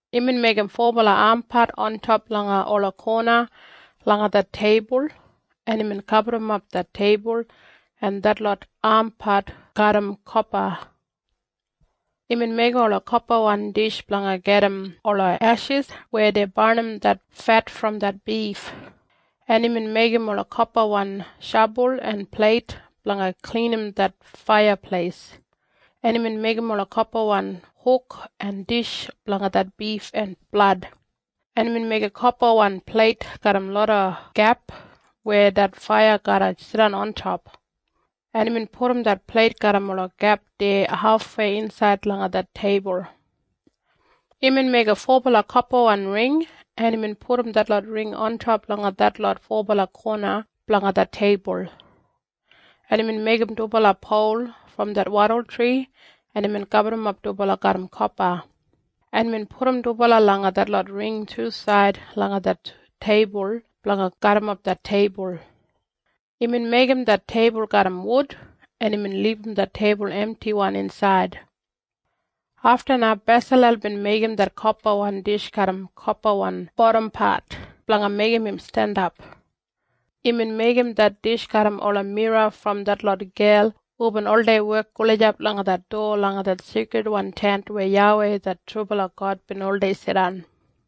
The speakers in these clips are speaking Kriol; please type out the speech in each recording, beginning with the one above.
Imbin meigim fobala ampat ontop langa ola kona langa det teibul, en imbin gaburrumap det teibul en detlot ampat garram kopa. Imbin meigim ola kopawan dish blanga gajim ola eshis weya dei barnim det fet brom det bif, en imbin meigim ola kopawan shabul en pleit blanga klinim det faiyapleis, en imbin meigim ola kopawan huk en dish blanga det bif en blad, en imbin meigim kopawan pleit garram loda gep weya det faiya garra jidan ontop, en imbin pudum det pleit garram ola gep deya hafwei insaid langa det teibul. Imbin meigim fobala kopawan ring, en imbin pudum detlot ring ontop langa detlot fobala kona blanga det teibul, en imbin meigim dubala pol brom det wadultri, en imbin gaburrumap dubala garram kopa, en imbin pudum dubala langa detlot ring tusaid langa det teibul blanga garrimap det teibul. Imbin meigim det teibul garram wud, en imbin libum det teibul emtiwan insaid. Afta na Besalel bin meigim det kopawan dish garram kopawan bodampat blanga meigim im jandap. Imbin meigim det dish garram ola mira brom detlot gel hubin oldei wek gulijap langa det dowa langa det Seikridwan Tent weya YAWEI det trubala God bin oldei jidan.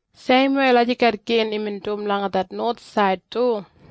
Seimwei lagijat gin imbin dum langa det nowathsaid du.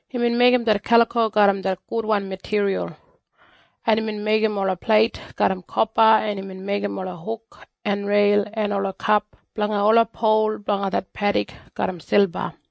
Imbin meigim det kaliko garram det gudwan matiriyal, en imbin meigim ola pleit garram kopa, en imbin meigim ola huk en reil en ola kep blanga ola pol blanga det pedik garram silba.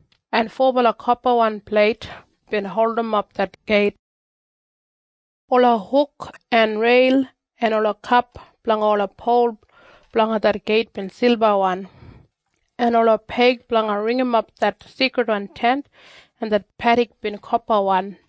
en fobala kopawan pleit bin holdimap det geit. Ola huk en reil en ola kep blanga ola pol blanga det geit bin silbawan, en ola peig blanga ringimap det Seikridwan Tent en det pedik bin kopawan.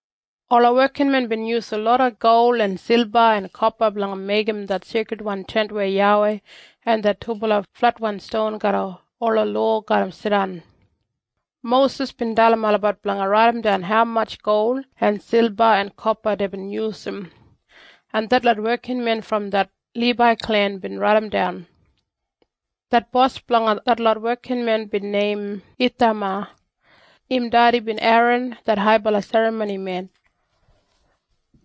Ola wekinmen bin yusum loda gol en silba en kopa blanga meigim det Seikridwan Tent weya YAWEI en det dubala fletwan ston garram ola lowa garra jidan. Mosis bin dalim olabat blanga raidimdan haumatj gol en silba en kopa deibin yusum, en detlot wekinmen brom det Libai klen bin raidimdan. Det bos blanga detlot wekinmen bin neim Ithama. Im dedi bin Eran det haibala serramonimen.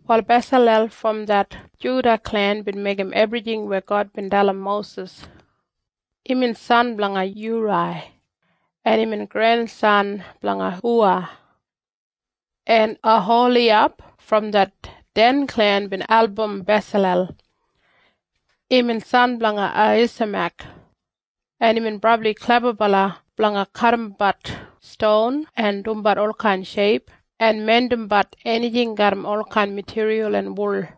Wal Besalel brom det Juda klen bin meigim ebrijing weya YAWEI bin dalim Mosis. Imbin san blanga Yurai, en imbin grensan blanga Huwa. En Oholiyab brom det klen gulum Den bin album Besalel. Imbin san blanga Ahisamek, en imbin brabli klebabala blanga kadimbat ston en dumbat olkain sheip en mindimbat enijing garram olkain matiriyal en wul.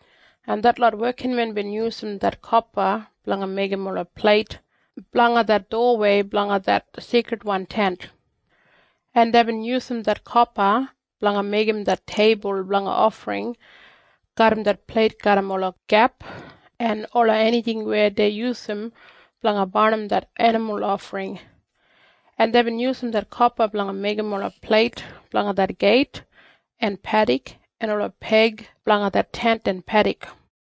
en detlot wekinmen bin yusum det kopa blanga meigim ola pleit blanga det dowawei blanga det Seikridwan Tent, en deibin yusum det kopa blanga meigim det teibul blanga ofring garram det pleit garram ola gep en ola enijing weya dei yusum blanga barnim det enimul ofring, en deibin yusum det kopa blanga meigim ola pleit blanga det geit en pedik en ola peig blanga det Tent en pedik.